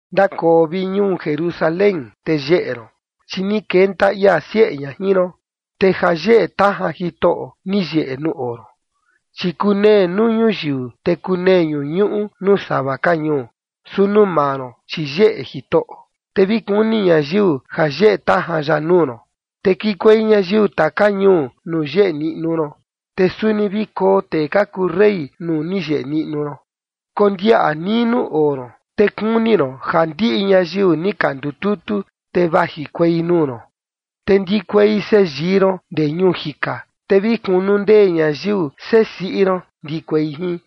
Ndakoo, vi ñuu Jerusalén, te yeꞌe ron, chi ni kenta ia sieꞌe ña jin ron, te ja yeꞌe tajan Jitoꞌo ni yeꞌe nuu oo ron. Chi kunee nuu ñuyiu, te kunee ñuñuꞌu nuu sava ka ñuu. Su nuu maa ron, chi yeꞌe Jitoꞌo, te vi kuni ñayiu ja yeꞌe tajan ya nuu ron. Te kikuei ñayiu taka ñuu nuu yeꞌe niꞌnu ron, te suni vi koo tee ka kuu rey nuu ni yeꞌe niꞌnu ron. Kondiaꞌa nii nuu oo ron, te kuni ron ja ndiꞌi ñayiu ni ka ndututu, te vajikuei nuu ron. Te ndikuei seyii ron ndee ñuu jika, te vi kunundee ñayiu sesiꞌi ron ndikuei jin.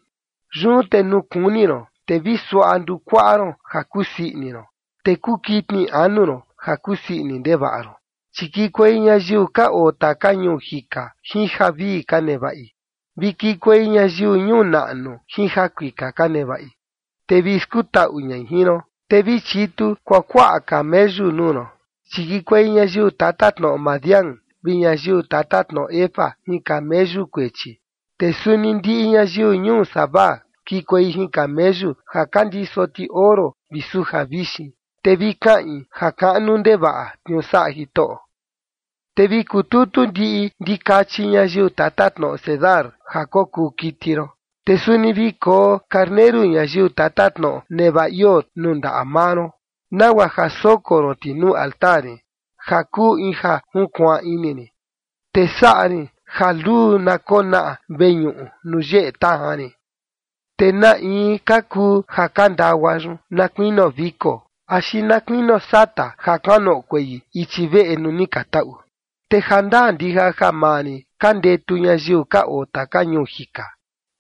Yun te nuu kuni ron, te vi suaꞌa ndukuaꞌa ron ja kusii ini ron, te kuu kitni anu ron ja kusii ini ndevaꞌa ron, chi kikuei ñayiu ka oo taka ñuu jika jin javii ka nevaꞌi, vi kikuei ñayiu ñuu naꞌnu jin jakuika ka nevaꞌi, te vi skutaꞌu ñai jin ron. Te vi chitu kuakuaꞌa cameyu nuu ron, chi kikuei ñayiu tatatnoꞌo Madián vi ñayiu tatatnoꞌo Efa jin cameyu kuechi, te suni ndiꞌi ñayiu ñuu Sabá kikuei jin cameyu ja ka ndiso ti oro vi suja vixin, te vi kaꞌin ja kaꞌnu ndevaꞌa tniuu saꞌa Jitoꞌo. Te vi kututu ndiꞌi ndikachi ñayiu tatatnoꞌo Cedar ja kokuu kiti ron, te suni vi koo karneru ñayiu tatatnoꞌo Nebaiot nuu ndaꞌa maa ron, nagua ja soko ron ti nuu altar rin ja kuu in ja junkuaan ini rin. Te saꞌa rin ja luu na konaꞌa veñuꞌu nuu yeꞌe tajan rin. ¿Te na in ka kuu ja ka ndagua yun, na kuinio viko, axi na kuinio sata ja kuanoꞌokuei ichi veꞌe nuu ni ka taꞌu? Te jandaa ndija ja maa rin ka ndetu ñayiu ka oo taka ñuu jika.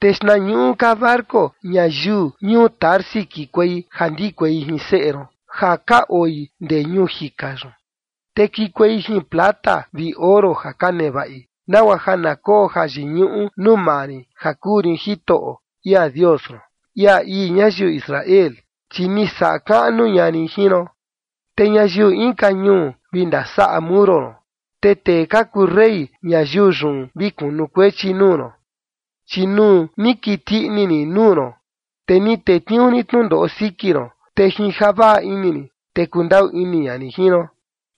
Te xtnañuꞌu ka barco ñayiu ñuu Tarsis kikuei ja ndikuei jin seꞌe ron ja ka oi ndee ñuu jika yun, te kikuei jin plata vi oro ja ka nevaꞌi, nagua ja na koo jayiñuꞌu nuu maa rin ja kuu rin Jitoꞌo, ia Dios ron, ia ii ñayiu Israel, chi ni saꞌa kaꞌnu ña rin jin ron. Te ñayiu inka ñuu vi ndasaꞌa muro ron, te tee ka kuu rey ñayiu yun vi kunukuechi nuu ron. Chi nuu ni kiti ini rin nuu ron, te ni tetniuu rin tnundoꞌo siki ron, te jin javaꞌa ini rin, te kundaꞌu ini ña rin jin ron.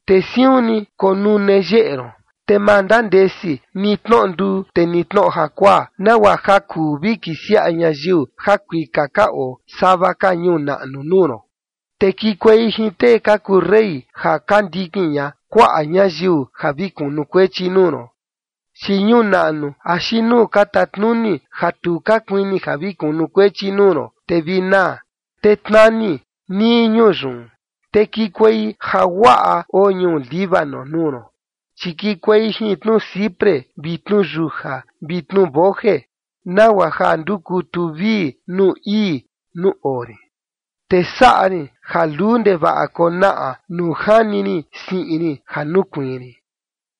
Te siun ni konune yeꞌe ron, te ma ndandesi ni tnoꞌo nduu, te ni tnoꞌo jakuaa, nagua ja kuu vi kisiaꞌa ñayiu jakuika ka oo sava ka ñuu naꞌnu nuu ron, te kikuei jin tee ka kuu rey ja ka ndikin ña kuaꞌa ñayiu ja vi kunukuechi nuu ron. Chi ñuu naꞌnu axi nuu ka tatnuni ja tu ka kuini ja vi kunukuechi nuu ron, te vi naa, te tnani nii ñuu yun. Te kikuei jaguaꞌa oo ñuu Líbano nuu ron. Chi kikuei jin tnuciprés vi tnuyuja vi tnuboje, nagua ja ndukutu vii nuu ii nuu oo rin. Te saꞌa rin ja luu ndevaꞌa konaꞌa nuu jani rin siꞌin rin ja nukuiin rin.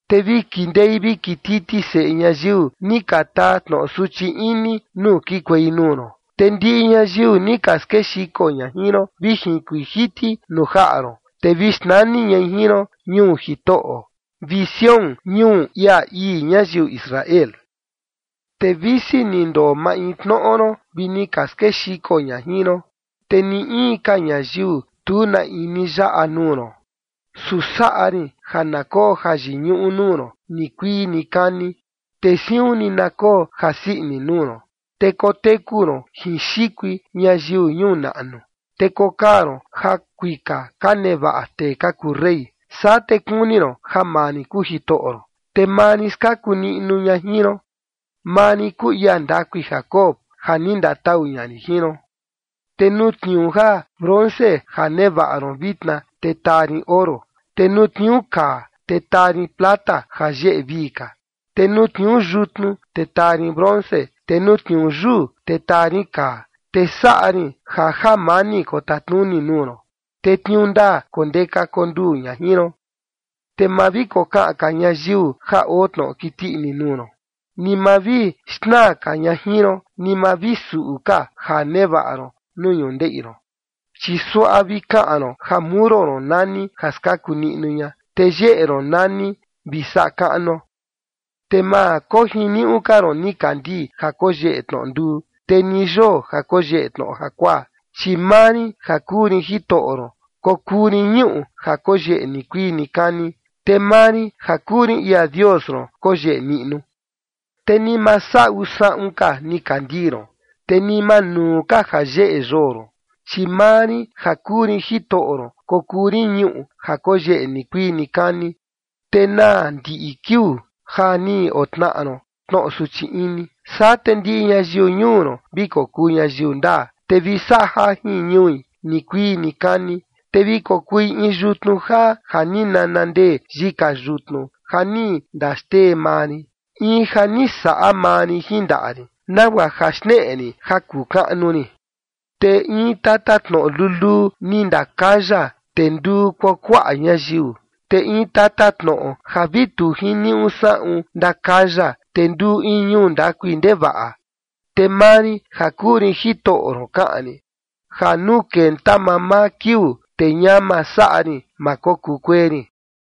Te vi kindei vi kititi seꞌe ñayiu ni ka taa tnoꞌo suchi ini nuu kikuei nuu ron, te ndiꞌi ñayiu ni ka skexiko ña jin ron, vi jinkuiin jiti nuu jaꞌa ron. Te vi xnani ñai jin ron “ñuu Jitoꞌo”, vi “Sión, ñuu ia ii ñayiu Israel”. Te visi ni ndoo maintnoꞌo ron vi ni ka skexiko ña jin ron, te ni in ka ñayiu, tu na in ni yaꞌa nuu ron. Su saꞌa rin ja na koo jayiñuꞌu nuu ron nikuii nikani, te siun ni na koo jasii ini nuu ron. Te koteku ron jin xikui ñayiu ñuu naꞌnu, te kokaa ron jakuika ka nevaꞌa tee ka kuu rey. Saa te kuni ron ja maa rin kuu Jitoꞌo ron, te maa rin skaku niꞌnu ña jin ron. Maa rin kuu ia ndakui Jacob ja ni ndatau ña rin jin ron. Te nuu tniuu ja bronce ja nevaꞌa ron vitna, te taa rin oro, te nuu tniuu kaa, te taa rin plata ja yeꞌe vii ka. Te nuu tniuu yutnu, te taa rin bronce, te nuu tniuu yuu, te taa rin kaa. Te saꞌa rin ja jamani kotatnuni nuu ron, te tniuu ndaa kondeka konduu ña jin ron. Te ma vi kokaꞌan ka ñayiu ja oo tnoꞌo kiti ini nuu ron, ni ma vi xnaa ka ña jin ron, ni ma vi suꞌu ka ja nevaꞌa ron nuu ñundeꞌi ron, chi suaꞌa vi kaꞌan ron ja muro ron nani “ja skaku niꞌnu ña”, te yeꞌe ron nani “vi saꞌa kaꞌnuo”. Te ma kojiniuꞌu ka ron nikandii ja koyeꞌe tnoꞌo nduu, te ni yoo ja koyeꞌe tnoꞌo jakuaa, chi maa rin ja kuu rin Jitoꞌo ron kokuu rin ñuꞌu ja koyeꞌe nikuii nikani, te maa rin ja kuu rin ia Dios ron koyeꞌe niꞌnu. Te ni ma saꞌu saꞌun ka nikandii ron, te ni ma nuu ka ja yeꞌe yoo ron, chi maa rin ja kuu rin Jitoꞌo ron kokuu rin ñuꞌu ja koyeꞌe nikuii nikani, te naa ndiꞌi kiuu ja ni otnaꞌa ron tnoꞌo suchi ini. Saa te ndiꞌi ñayiu ñuu ron vi kokuu ñayiu ndaa, te vi saꞌa jajin ñui nikuii nikani. Te vi kokui in yutnu jaa ja ni nanandee yika yutnu ja ni ndaxtee maa rin, in ja ni saꞌa maa rin jin ndaꞌa rin, nagua ja xneꞌe rin ja kuu kaꞌnu rin. Te in tatatnoꞌo luluu ni ndakaya, te nduu kuakuaꞌa ñayiu. Te in tatatnoꞌo ja vi tu jiniuꞌu saꞌun ndakaya, te nduu in ñuu ndakui ndevaꞌa. Te maa rin ja kuu rin Jitoꞌo ron kaꞌan rin, ja nuu kenta mamaa kiuu, te ñama saꞌa rin, ma kokuu kuee rin.